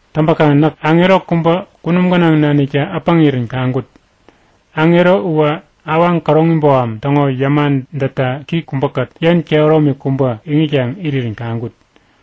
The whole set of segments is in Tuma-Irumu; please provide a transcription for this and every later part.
Täŋpäkaŋ näk aŋero kubä kunum gänaŋ naniktä äpäŋirän kaŋkut. Aŋero uwä awaŋ käroŋi boham täŋo yäma dätta ki kubäkät yen kehäromi kubä iŋitkaŋ irirän kaŋkut.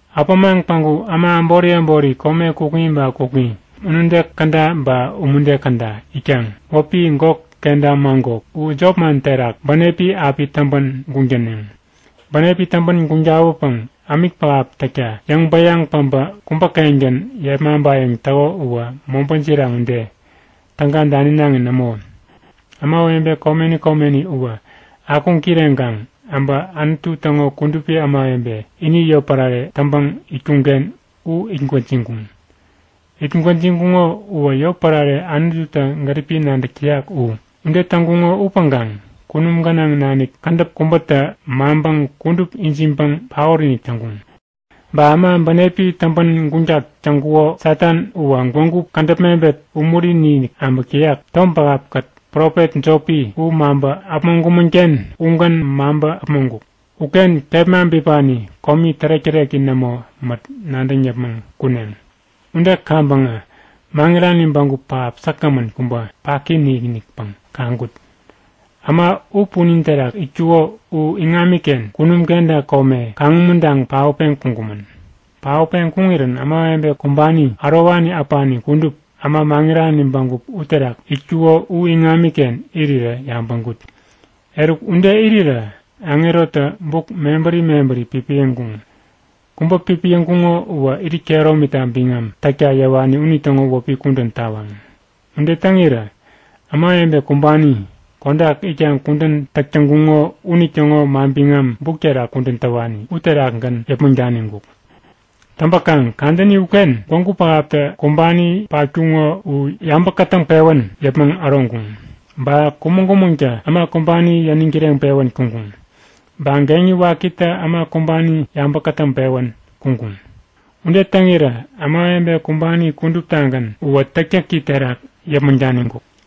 Äpämaŋ päŋku äma äbori äbori kome kukŋi ba kukŋi, unude käda ba umude käda itkaŋ wäpi Gok kenta Magok, u jopman terak bänepi api täŋpän guŋ täneŋ. Bänepi täŋpän guŋ tawäpäŋ ämik pähap täkta yäŋ-bäyaŋ päbä kubä-kengän yepmaŋpayäŋ täko uwä mobä jiraŋ ude, täga daninaŋi nämo. Ämawebe komeni komeni uwä akuŋ kireŋkaŋ äbä Anutu täŋo kudupi ämawebe ini yotpärare täŋpäŋ itkuŋken u it gwäjiŋkuŋ. It gwäjiŋkuŋo uwä yotpärare Anututä gäripi nadäk täyak u. Ude täŋkuŋo upäŋkaŋ kunum gänaŋ nanik kädäp kubätä maŋpäŋ kudup ijiŋpäŋ paot-inik täŋkuŋ. Ba äma bänepi täŋpän guŋtak täŋkuko Satan uwä gwägu, kädäp mebet umuri-inik äbäk täyak, tom pähap-kät profet jopi u maŋpä äpmoŋkumän-ken ugän maŋpä äpmoŋkuk. Uken kepma bipani komi tärek-täreki nämo mät nadäŋ yäpmäŋ kuneŋ. Ude kaŋpäŋä maŋirani bägup pähap säkgämän kubä, paki-inikpäŋ kaŋkut. Äma u punin terak itkuko u iŋamiken kunum kenta kome kaŋumuntaŋ paotpeŋ kuŋkumän. Paotpeŋ kuŋirän ämawebe kumbani ärowani äpani kudup, äma maŋirani bägup uterak itkuko u iŋamiken irirä yabäŋkut. Eruk ude irirä aŋerotä buk mebäri mebäri pipiyäŋkuŋ. Kubä pipiyäŋkuŋo uwä irit kehäromita biŋam täkta yäwani unitäŋo wäpi kudän tawaŋ. Ude täŋirä ämawebe kumbani, kodak itkaŋ kudän täk täŋkuŋo unitäŋo manbiŋam buk terak kudän täwani uterakgän yäpmäŋ daniŋkuk. Täŋpäkaŋ kadäni uken gwägu pähaptä kumbani patkuŋo u yabä kätäŋpewän yäpmäŋ äroŋkuŋ. Ba Kumäŋ-kumäŋtä äma kumbani yäniŋ kireŋpewän kuŋkuŋ. Ba Geŋi Wakitä äma kumbani yabä kätäŋpewän kuŋkuŋ. Ude täŋirä ämawebe kumbani kuduptagän uwä täktäki terak yäpmäŋ daniŋkuk.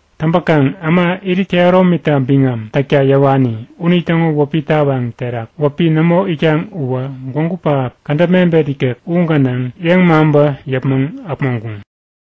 Täŋpäkaŋ äma, irit kehäromita biŋam täkta yäwani unitäŋo wäpi tawaŋ terak wäpi nämo itkaŋ uwä gwägu pähap kädäp mebet ikek u gänaŋ yepmaŋpä yäpmäŋ äpmoŋkuŋ.